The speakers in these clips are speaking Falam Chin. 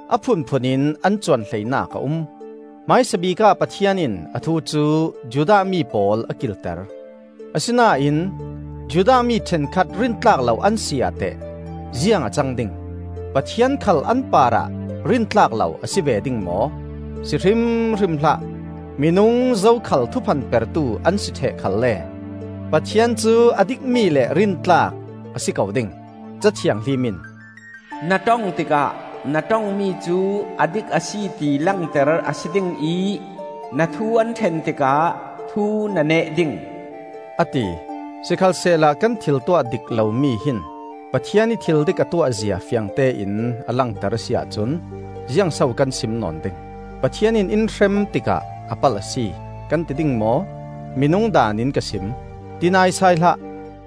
A phunphun in an cuan hleinak a um. Hmaisabik ah Pathian in a thu cu Judah mi pawl a kilter. Asinain Judah mi ṭhenkhat rintlak lo an si ah teh, ziang a cang ding? Pathian khal an parah rintlak lo a si ve ding maw? Si hrimhrim hlah! Minung zokhal thuphan pertu an si ṭheh khalle Pathian cu a dikmi le rintlak a si ko ding. Ca Thianghlim in, “Na ṭong tikah, Na ṭongmi cu a dik a si ti langter a si ding ih, Na thu an ṭhen tikah, thu na neh ding,” a ti. Sikhalsehla kan thil tuah dik lomi hin Pathian ih thil dik a tuahzia fiangtein a langter a si ahcun, ziangso kan sim nawn ding? Pathian in in hrem tikah a palh a si, kan ti ding maw? (Minung daan in ka sim.) Ti naisai hlah!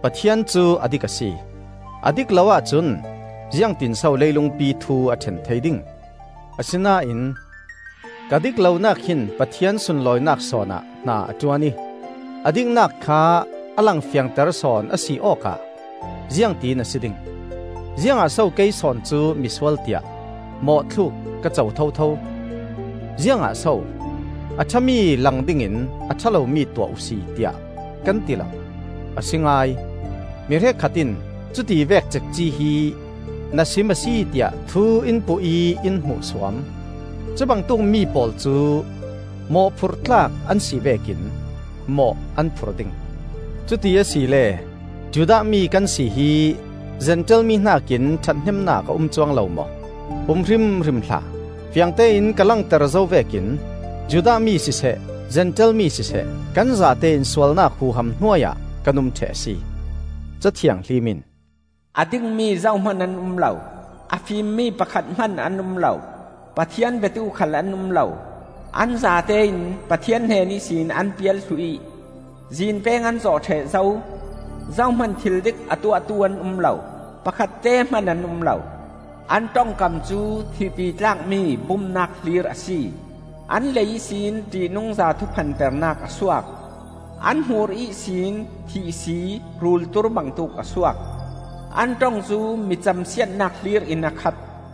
Pathian cu a dik a si; a dik lo ahcun ziangtinso leilungpi thu a ṭhen thei ding? Asinain ka dik lonak hin Pathian sunlawinak sawn ah hna a ṭuan ih a diknak kha a langfiangter sawn a si awk ah ziangtin a si ding? Ziangah so kei sawn cu misual tiah mawhthluk ka co thotho? Ziangah so, “A ṭhami lang dingin a ṭha lomi tuah uhsi,” tiah kan ti lo? A si ngai; mi hrekkhat in cu tivek cekci hi na sim a si tiah thu in puh ih in hmuhsuam. Cubangtuk mi pawl cu mawhphurh tlak an si vekin mawh an phur ding. Cuti asile, Judah mi kan si hi Zentail mi hnakin ṭhathnemnak a um cuang lo maw? Um hrimhrim hlah! Fiangtein ka langter zo vekin Judah mi siseh Zentail mi siseh, kan zatein sualnak huham hnuai ah kan um ṭheh a si. Ca Thianghlim in: “A dingmi zohman an um lo, A fimmi pakhat hman an um lo, Pathian biatu khal an um lo. An zatein Pathian hnen ihsin an pial thluh ih, zinpeng an zawh ṭheh zo. Zohman thildik a tuahtu an um lo, pakhatte hman an um lo. An ṭongkam cu thihpi tlakmi bumnak hlir a si; An lei ihsin ṭihnungza thuphan pernak a suak; An hmur ihsin thihsii, rul tur bangtuk a suak. An ṭong cu mi camsiatnak hlir in a khat.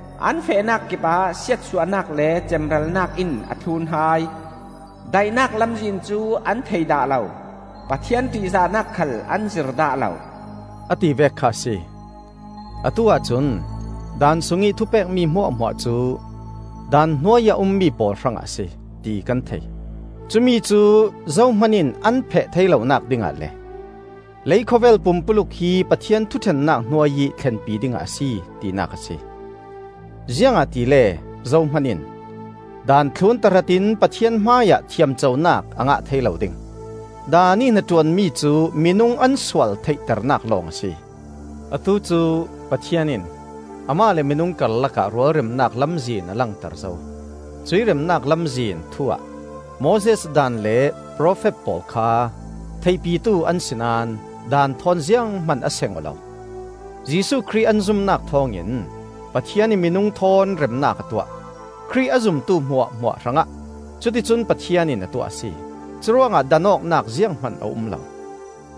An fehnak kipah siatsuahnak le cemralnak in a thlun hai. Daihnak lamzin cu an thei dah lo; Pathian ṭihzahnak khal an zir dah lo,” a tivek kha a si. Atu-ah cun Daan sungih thupekmi hmuahhmuah cu Daan hnuai ih a ummi pawl hrangah a si, ti kan thei. Cumi cu zohman in an phet thei lonak dingah le leikhawvel pumpuluk hi Pathian thuṭhennak hnuai ih thlenpi dingah a si, tinak a si. Ziangahtile zohman in Daan thlun tahratin Pathian hmaiah thiamconak a ngah thei lo ding. Daan ih hnaṭuanmi cu minung an sual theihternak lawng a si. Atu cu Pathian in Amah le minung karlakah rualremnak lamzin a langter zo. Cuih remnak lamzin thu-ah Moses Daan le profet pawl kha theihpitu an si naón Daan thawn zianghman a seng aw lo. Jesuh Khrih an zumnak thawngin Pathian in minung thawn remnak a tuah. Khrih a zumtu hmuahhmuah hrangah cuti cun Pathian in a tuah a si; curuangah dan awknak zianghman a um lo;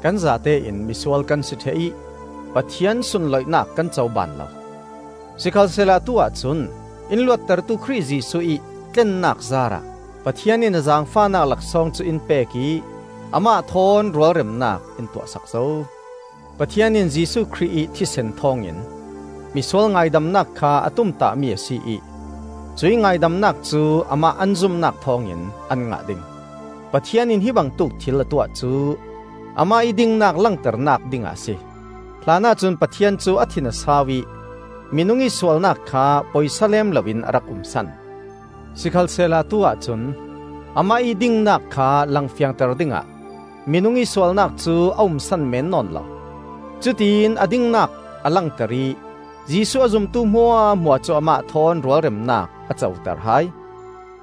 kan zatein misual kan si ṭheh ih Pathian sunloihnak kan co baan lo. Sikhalsehla atu-ah cun in luattertu Khrih Jesuh ih tlennak zaar ah Pathian in a zaangfahnak laksawng cu in pek ih Amah thawn rualremnak in tuahsak zo. Pathian in Jesuh Khrih ih thisen thawngin misual ngaidamnak kha a tumtahmi a si ih, cuih ngaidamnak cu amah an zumnak thawngin an ngah ding. Pathian in hi bangtuk thil a tuah cu amah ih dingnak langternak dingah a si. Hlanah cun Pathian cu a thin a sau ih minung ih sualnak kha poisa lem loin a rak umsan. Sikhalsehla atu-ah cun Amah ih dingnak kha langfiangter dingah minung ih sualnak cu a umsan meen nawn lo; cutiin a dingnak a langter ih Jesuh a zumtu hmuahhmuah cu Amah thawn rualremnak a coter hai.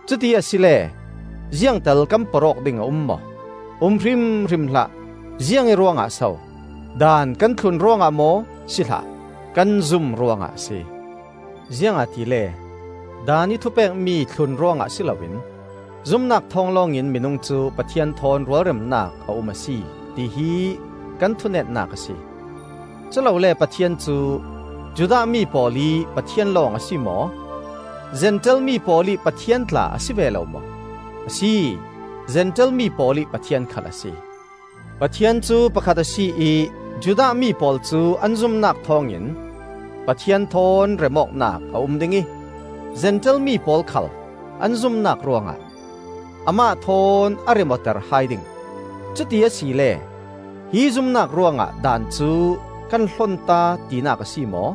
Cuti asile ziangtal kan porh awk ding a um maw? Um hrimhrim hlah! Ziangih ruangah so? Daan kan thlun ruangah maw? Si hlah! Kan zum ruangah a si. Ziangahtile Daan ih thupekmi thlun ruangah si loin zumnak thawng lawngin minung cu Pathian thawn rualremnak a um a si, tihi kan thu netnak a si. Culole Pathian cu Judah mi pawl ih Pathian lawng a si maw? Zentail mi pawl ih Pathian tla a si ve lo maw? A si, Zentail mi pawl ih Pathian khal a si. Pathian cu pakhat a si ih Judah mi pawl cu an zumnak thawngin Pathian thawn remawknak a um ding ih Zentail mi pawl khal an zumnak ruangah Amah thawn a rem awter hai ding. Cuti asile hi zumnak ruangah Daan cu kan hlonta, tinak a si maw?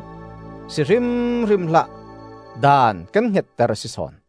Si hrimhrim hlah! Daan kan hngetter a si sawn.